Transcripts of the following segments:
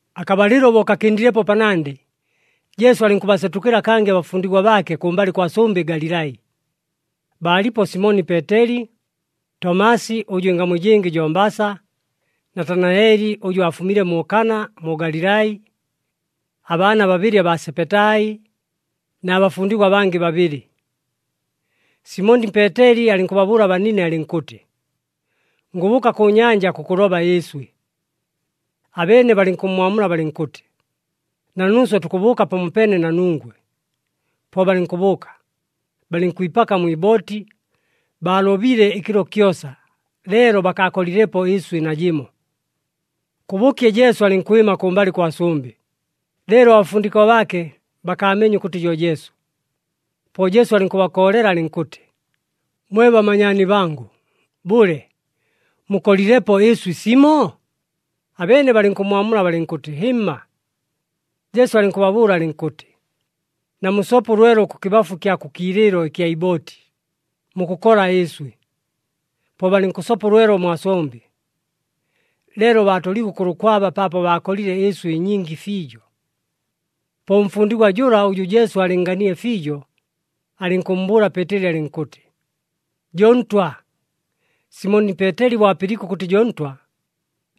Akabalɨlo bo kakɨndilepo panandɨ, Jesu alɨnkʉbasetʉkɨla kangɨ abafundigwa baake kʉmbalɨ kwa sʉmbɨ Galilai. Baalipo Simoni Peeteli, Tomasi ʉjʉ ɨngamu ɨjɨngɨ jo Mbasa, Natanaeli ʉjʉ aafumile mu Kana mu Galilai, abaana babɨlɨ abaa Sebetai, na bafundigwa abangɨ babɨlɨ. Simoni Peeteli alɨnkʉbabʉʉla abanine alɨnkʉtɨ, “Ngʉbʉʉka kʉ nyanja kʉkʉloba ɨɨswɨ.” Abeene balɨnkʉmmwamula balɨnkʉtɨ, “Na nuuswe tukʉbʉʉka pamopeene na nungwe.” Po balɨnkʉbʉʉka, balɨnkwipaka mwi ibooti, baalobile ɨkɨlo kyosa, leelo bakaakolilepo ɨɨswɨ najɨmo. Kʉbʉkye, Jesu alɨnkwɨma kʉmbalɨ kwa sʉmbɨ, leelo abafundigwa baake bakaameenye ʉkʉtɨ jo Jesu. Po Jesu alɨnkʉbakoolela alɨnkʉtɨ, “Mwe bamanyaani bangʉ, bʉle, mukolilepo ɨɨswɨ simo?” Abeene balɨnkʉmmwamula balɨnkʉtɨ, “Hɨmma.” Jesu alɨnkʉbabʉʉla alɨnkʉtɨ, “Namusope ʉlwelo kʉkɨbafu kya kʉ kiilɨɨlo ɨkya ibooti, mukʉkola ɨɨswɨ.” Po balɨnkʉsopa ʉlwelo mwa sʉmbɨ, leelo baatoliigwe ʉkʉlʉkwaba paapo baakolile ɨɨswɨ ɨnyingi fiijo. Po ʉmfundigwa jʉla ʉjʉ Jesu aalɨnnganile fiijo, alɨnkʉmmbʉʉla Peeteli alɨnkʉtɨ, “Jo Ntwa!” Simoni Peeteli bo apɨliike ʉkʉtɨ jo Ntwa,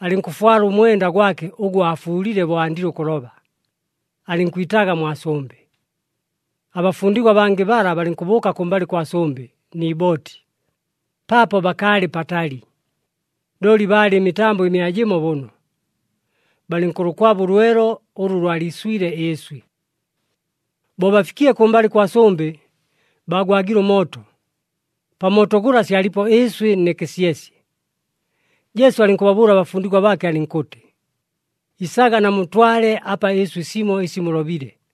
alɨnkʉfwala ʉmwenda gwake ʉgʉ aafuulile bo andile ʉkʉloba, alɨnkwitaaga mwa sʉmbɨ. Abafundigwa abangɨ bala balɨnkʉbʉʉka kʉmbalɨ kwa sʉmbɨ ni ibooti, paapo bakaalɨ patali, looli baalɨ ɨmitambo ɨmia jɨmo bʉno. Balɨnkʉlʉkwaba ʉlwelo ʉlʉ lwaliiswile ɨɨswɨ. Bo bafikile kʉmbalɨ kwa sʉmbɨ, baagwagile ʉmooto. Pa mooto gʉla syalipo ɨɨswɨ nɨ kɨsyesye. Jesu alɨnkʉbabʉʉla abafundigwa baake alɨnkʉtɨ, “Isaga, namutwale apa ɨɨswɨ simo ɨsi mulobile.”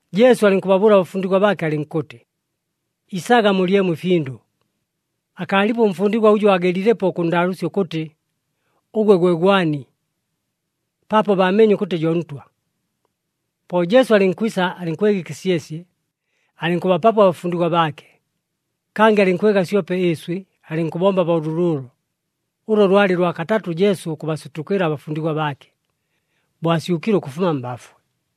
Jesu alɨnkʉbabʉʉla abafundigwa baake alɨnkʉtɨ, “Isaga mulyemo ɨfindʉ.” Akaalipo ʉmfundigwa ʉjʉ aagelilepo ʉkʉnndaalʉʉsya ʉkʉtɨ, “Ʉgwe gwe gwani?” Paapo baameenye ʉkʉtɨ jo Ntwa. Po Jesu alɨnkwisa, alɨnkwega ɨkɨsyesye, alɨnkʉbapapo abafundigwa baake. Kangɨ alɨnkwega syope ɨɨswɨ, alɨnkʉbomba bo lʉlʉʉlo. Ʉlo lwalɨ lwa katatʉ Jesu ʉkʉbasetʉkɨla abafundigwa baake, bo asyʉkile ʉkʉfuma mbafwe.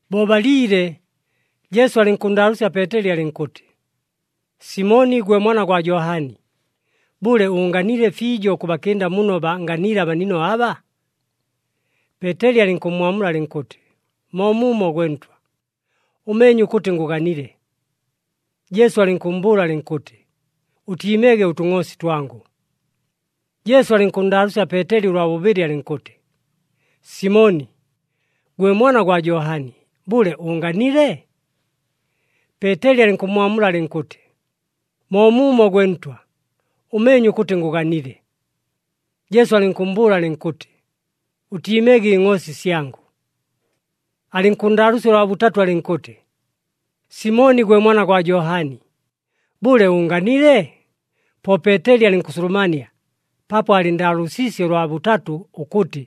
Bo baliile, Jesu alɨnkʉnndaalʉʉsya Peeteli alɨnkʉtɨ, “Simoni gwe mwana gwa Johani, bʉle, ʉʉnganile fiijo ʉkʉbakɨnda muno baanganiile abanino aba?” Peeteli alɨnkʉmmwamula alɨnkʉtɨ, “Moomuumo gwe Ntwa, ʉmeenye ʉkʉtɨ ngʉganile.” Jesu alɨnkʉmmbʉʉla alɨnkʉtɨ, “Ʉtiimege ʉtʉngʼoosi twangʉ.” Jesu alɨnkʉnndaalʉʉsya Peeteli ʉlwa bʉbɨlɨ alɨnkʉtɨ, “Simoni gwe mwana gwa Johani, bʉle ʉʉnganile?” Peeteli alɨnkʉmmwamula alɨnkʉtɨ, “Moomuumo gwe Ntwa, ʉmeenye ʉkʉtɨ ngʉganile.” Jesu alɨnkʉmmbʉʉla alɨnkʉtɨ, “Ʉtiimege ɨngʼoosi syangʉ.” Alɨnkʉnndaalʉʉsya ʉlwa bʉtatʉ alɨnkʉtɨ, “Simoni gwe mwana gwa Johani, bʉle ʉʉnganile?” Po Peeteli alɨnkʉsulumania paapo aalɨnndaalʉʉsiisye ʉlwa bʉtatʉ ʉkʉtɨ,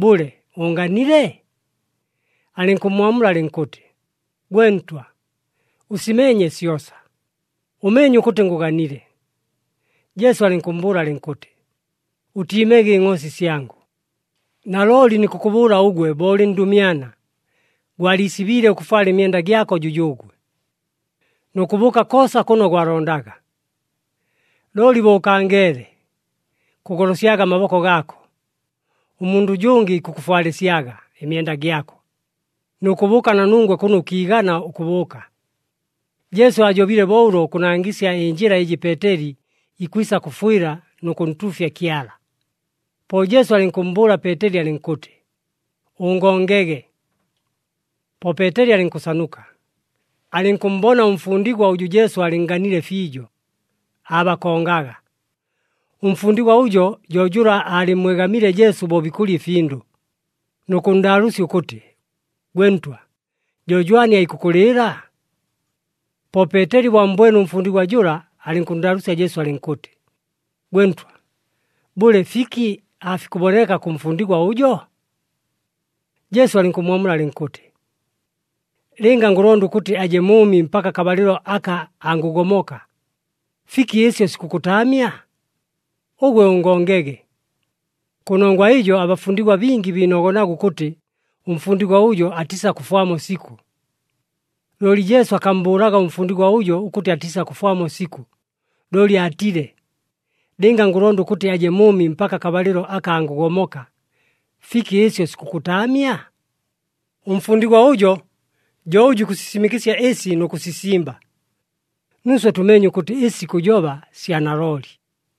“Bʉle, ʉʉnganile?” Alɨnkʉmmwamula alɨnkʉtɨ, “Gwe Ntwa, ʉsimeenye syosa. Ʉmeenye ʉkʉtɨ ngʉganile.” Jesu alɨnkʉmmbʉʉla alɨnkʉtɨ, “Ʉtiimege ɨngʼoosi syangʉ. Nalooli nikʉkʉbʉʉla ʉgwe bo ʉlɨ ndʉmyana, gwaliisibiile ʉkʉfwala ɨmyenda gyako jʉjʉʉgwe, nʉ kʉbʉʉka koosa kʉno gwalondaga. Looli bo ʉkangeele, kʉgolosyaga amaboko gaako, ʉmundʉ ʉjʉngɨ ikʉkʉfwalɨsyaga ɨmyenda gyako, nʉ kʉbʉʉka na nungwe kʉno ʉkiigana ʉkʉbʉʉka.” Jesu aajobile bo ʉlo ʉkʉnangɨsya ɨnjɨla ɨjɨ Peeteli ikwisa kʉfwɨla nʉ kʉntuufya Kyala. Po Jesu alɨnkʉmmbʉʉla Peeteli alɨnkʉtɨ, “Ʉngongege.” Po Peeteli alɨnkʉsanuka, alɨnkʉmmbona ʉmfundigwa ʉjʉ Jesu aalɨnnganile fiijo, aabakongaga. Ʉmfundigwa ʉjo jo jʉla aalɨmmwegamiile Jesu bo bikʉlya ɨfindʉ, nʉ kʉnndaalʉʉsya ʉkʉtɨ, “Gwe Ntwa, jo jwani aikʉkʉlɨɨla?” Po Peeteli bo ammbwene ʉmfundigwa jʉla, alɨnkʉnndaalʉʉsya Jesu alɨnkʉtɨ, “Gwe Ntwa, bʉle, fiki aafikʉboneka kʉ mfundigwa ʉjo?” Jesu alɨnkʉmmwamula alɨnkʉtɨ, “Lɨnga ngʉlonda ʉkʉtɨ aje mʉʉmi mpaka akabalɨlo aka angʉgomoka, fiki ɨsyo sikʉkʉtaamya? Ʉgwe ʉngongege.” Kʉnongwa ɨjo, abafundigwa bingi biinogonaga ʉkʉtɨ ʉmfundigwa ʉjo atiisakʉfwamo sikʉ. Looli Jesu akammbʉʉlaga ʉmfundigwa ʉjo ʉkʉtɨ atiisakʉfwamo sikʉ, looli aatile, “Lɨnga ngʉlonda ʉkʉtɨ aje mʉʉmi mpaka akabalɨlo aka angʉgomoka, fiki ɨsyo sikʉkʉtaamya?” Ʉmfundigwa ʉjo jo ʉjʉ ikʉsisimɨkɨsya ɨsi nʉ kʉsisimba. Nuuswe tʉmeenye ʉkʉtɨ ɨsi ikʉjoba sya nalooli.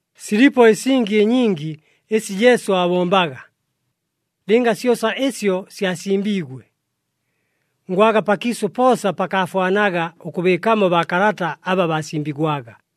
Silipo ɨsingi ɨnyingi ɨsi Jesu aabombaga. Lɨnga syosa ɨsyo syasimbiigwe, ngwaga pakiisʉ poosa pakaafwanaga ʉkʉbɨɨkamo baakalata aba baasimbigwaga.